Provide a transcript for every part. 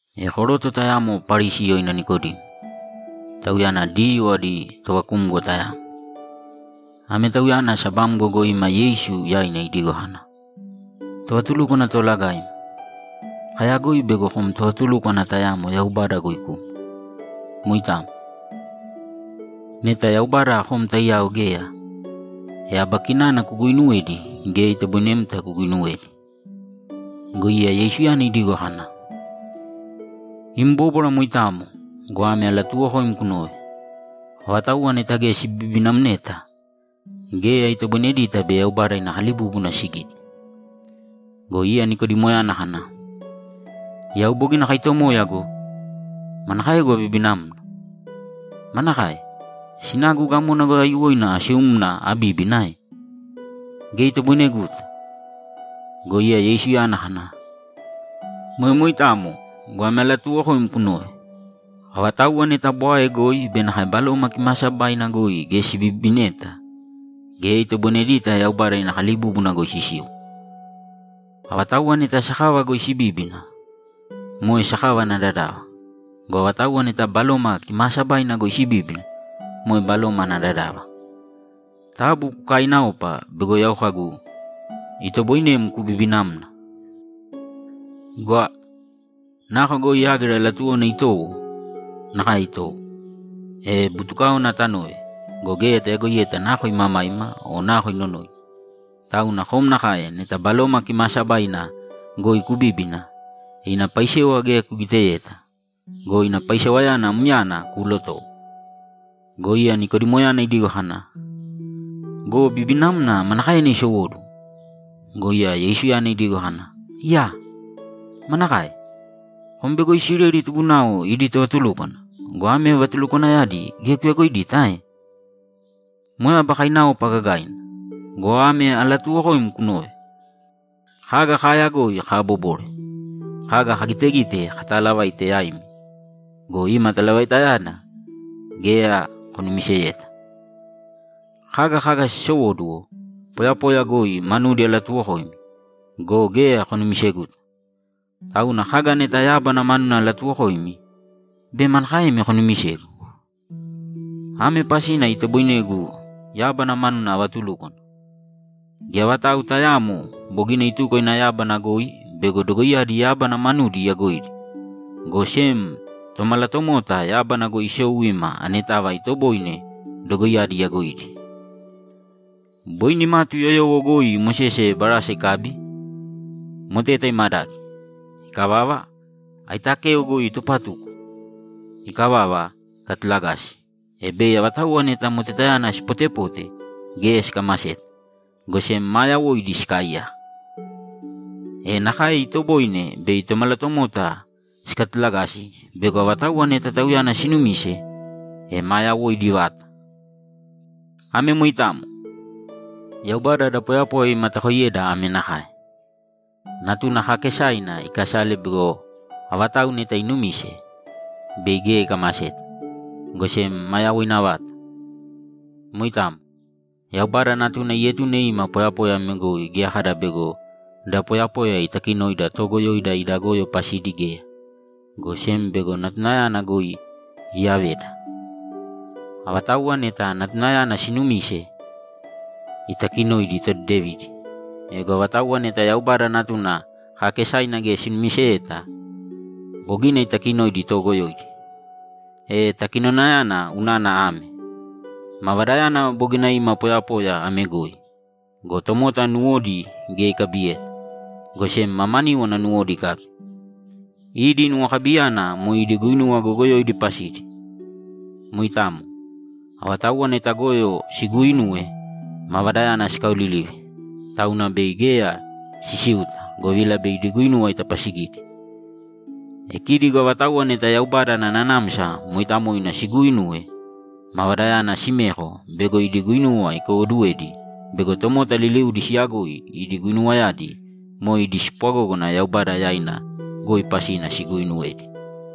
E koroto tayamo Parisi yoina Nikodimo. Tauyana Diyuu adi tovakumgo tayamo. Ame tauyana sabamgo goi ima Yeisu yaina idigo kana, ‘Tovatulúkwana Toolagaim, kayagoi bego kom tovatulúkwana tayamo Yaubada goi kuma. Moitamo. Neta Yaubada kom taiyao geya, e aba kinana kuguuinuwedi geya itoboinemta kuguinuwedi.’ Go iya Yeisuyana idigo kana, ‘Im bóbwara moitamo go, ame alatuuwokoim kunōve: Avatauwa neta geya sibibinamneta, geya itoboinedita bei Yaubada ina kalibúbuna sigite.’ Go iya Nikodimoyana kana, ‘Yau bogina akaitomoya go! Manakaegu abibinamna? Manakae? Sinagu gamona goi aiyuwoina asiumna abíbina ae? Geya itoboineguta!’ Go iya Yeisuyana kana, ‘Moe moitamo go, ame alatuuwokoim kunōve: Avatauwa neta bwae goi be nakae Baloma Kimaasabaina goi geya sibibineta, geya itoboinedita Yaubada ina kalibúbuna goi sisiu. Avatauwa neta sakava goi sibíbina, moe sakava ana dadava. Go avatauwa neta Baloma Kimaasabaina goi sibíbina, moe baloma ana dadava. Taabu kukaaināopa bego yau kagu, “Itoboinem kubibināmna.” Gwa! Nako goi yágira latuwona itowo, nakae itowo, e butukáona tanove go, geya tayagoiyeta nako imamaima o nako inonoina. Tauna kom nakae neta Baloma Kimaasabaina goi kubíbina. Ina paisewa geya kugiteyeta go, ina paisewayana myana kuulotowo.’ Go iya Nikodimoyana idigo kana, ‘Go bibinamna manakaena isowóduwo?’ Go iya Yeisuyana idigo kana, ‘Iyaa! Manakae? Kom bego Isileli tubunao idi tovatulúkwana go, ame vatulukwanayadi geya kuyagoidita ae? Moe aba kainaopa gagaina go, ame alatuuwokoim kunōve: Kaga kaayagoi kaabobore; kaga kagitegite katalavaite yaimi go, ima talavaitayana geya konumiseyeta. Kaga kaga sisowóduwo poyapoya goi manudi alatuwokoimi go, geya konumiseguta. Tauna kaga neta yábana manuna alatuwokoimi, bei manakaemi konumisegu? Ame pasina itoboinegu yábana manuna avatulúkwana: Geya vatau tayaamo bogina ituko ina yábana goi bego dogoiyadi yábana manuna iyagoidi, go sem Tomalatomota yábana goi isou ima anetava itoboine dogoiyadi iyagoidi. Boi nimatu yoyowo goi Mosese barasa ikabi, moteta imadagi. Ikavava, aitakeo goi itupatuko. Ikavava, ikatulagasi, e bei avatauwa neta motetayana sipotepote, geya sikamaseta, go sem maa yawoidi sikaaiyaka. E nakae itoboine bei Tomalatomota sikatulagasi bego avatauwa neta Tauyana sinumise, e maa yawoidi vata.’ Ame moitamo. Yaubada da poyapoya imatakoiyeda ame nakae: Natuna kaakesaina ikasale bego avatau neta inumise, bei geya ikamaseta, go sem maa yawoina vata. Moitamo. Yaubada Natuna ietune ima poyapoya ame goi geya kada bego da poyapoya itakinoida toogoyoida ida goyo pasidi geya, go sem bego Natunayana goi iyaveda. Avatauwa neta Natunayana siinumise, itakinoidi todedevidi. Ego avatauwa neta Yaubada Natuna kaakesaina geya sinumiseyeta, bogina itakinoidi toogoyoidi. E takinonayana unana ame: Mavadayana bogina ima poyapoya ame goi go, tomota nuwodi geya ikabiyeta, go sem mamaníwana nuwodi ikabi. Idi nuwokabiyana moe idi guinuwa goyogoyoidi pasidi. Moitamo. Avatauwa neta goyo siguuinuwe, Mavadayana sikaolilive, tauna bei geya sisiuta, govila bei idi guinuwa itapasigidi. E kidi go avatauwa neta Yaubada ana Nanamsa Mooitamoina siguuinuwe, Mavadayana simeko bego idi guinuwa ikaiwoduwedi bego tomota liliudi siyagoi idi guinuwayadi moe idi spwagógana Yaubada yaina goi pasina siguuinuwedi.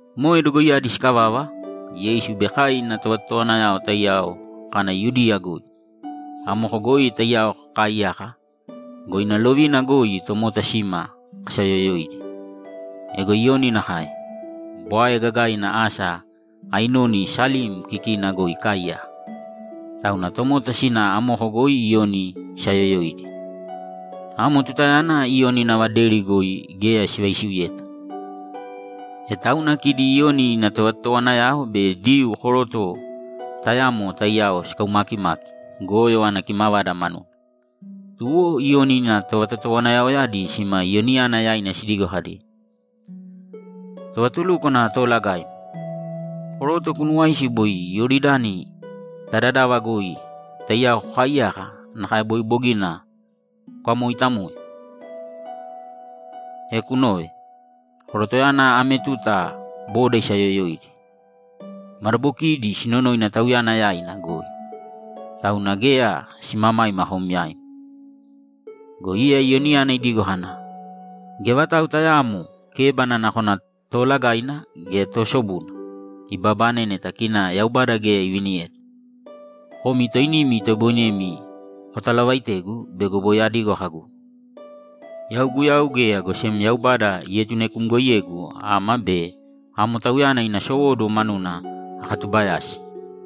Moe dogoiyadi sikavava, Yeisu be kai ina tovatotowanayao taiyao kana Yudiya goi. Amoko goi taiyao kakaaiyaka go, ina lovina goi tomota sima kasaayoyoidi. Ego Iyoni nakae. Bwae gagaina asa Ainoni Salim kikina goi ikaaiyaka, tauna tomota sina amoko goi Iyoni isaayoyoidi. Amo tutayana Iyoni nava deri goi geya sivaisiuyeta. E tauna kidi Iyoni ina tovatotowanayao be Diyuu koroto tayamo taiyao sikaumakimaki goyo ana kimavada manuna. Tuwo Iyoni ina tovatotowanayaoyadi sima Iyoniyana yaina sidigo kadi, ‘Tovatulúkwana Toolagaim, koroto kunuuwaisi boi Iyoridani ta dadava goi taiyao kokaaiyaka nakae boi bogina kukamooitamoe? E kunōve. Korotoyana ame tuta boda isaayoyoidi. Madabokiidi sinonoina Tauyana yaina goi. Tauna geya simamaima kom yaim.’ Go iya Iyoniyana idigo kana, ‘Geya vatau tayaamo kébana, nakona toolagaina gea toosobuna, ibabane neta kina Yaubada geya iviniyeta. Komi toinimi itoboinemi kotalavaitegu bego boi adigo kagu, “Yau Guyau geya, go sem Yaubada ietunekumgoiyegu ama be amo Tauyana ina sowóduwo manuna akatubayasi.”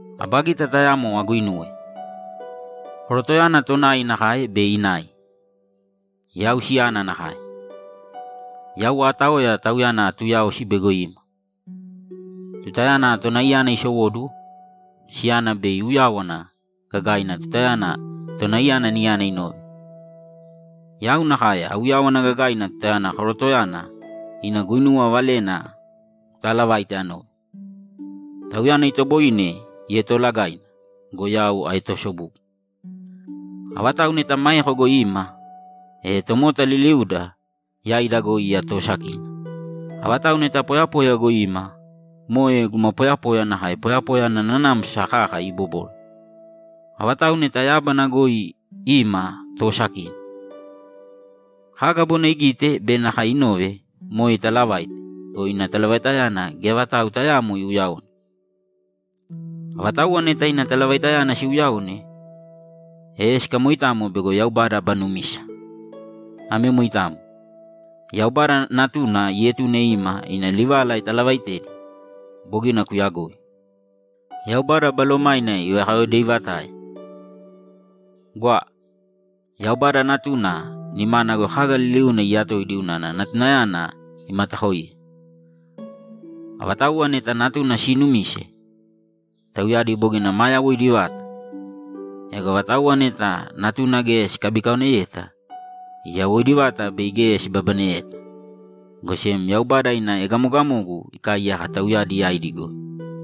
Aba gita tayamo aguinuwe: Korotoyana tonai nakae bei inai. Yau siyana nakae. Yau aataoya tauyana atuuyaosi bego ima. Tutayana tonaiyana isowóduwo, siyana bei iuyáwana gagaina tutayana tonaiyana niyana inove. Yau nakae auyáwana gagaina tutayana korotoyana ina guinuwa valena kutaalavaite anove. Tauyana itoboine ietoolagaina go, yau aetoosobugu.’ Avatau neta maeko goi ima, e tomota liliuda yaida goi iya toosakina. Avatau neta poyapoya goi ima, moe guma poyapoya nakae poyapoya ana nanamsa kaka ibobore. Avatau neta yábana goi ima toosakina. Kaga bogina igite be nakae inove, moe italavaite go, ina talavaitayana geya vatau tayaamo iuyaone. Avatauwa neta ina talavaitayana siuyaone, e sikamoitamo bego Yaubada aba numisa. Ame moitamo. Yaubada Natuna ietune ima ina livala italavaitedi. Bogina kuyagoi. Yaubada Balomaina ivakayaodeivatae. Gwa! Yaubada Natuna nimana goi kaga liliuna iyatoidi unana Natunayana imatakoiye. Avatauwa neta Natuna siinumise, tauyadi bogina maa yawoidi vata. Ego avatauwa neta Natuna geya sikabikaoneyeta, yawoidi vata bei geya sibabaneyeta, go sem Yaubada ina egamogamogu ikaaiyaka tauyadi yaidi goi.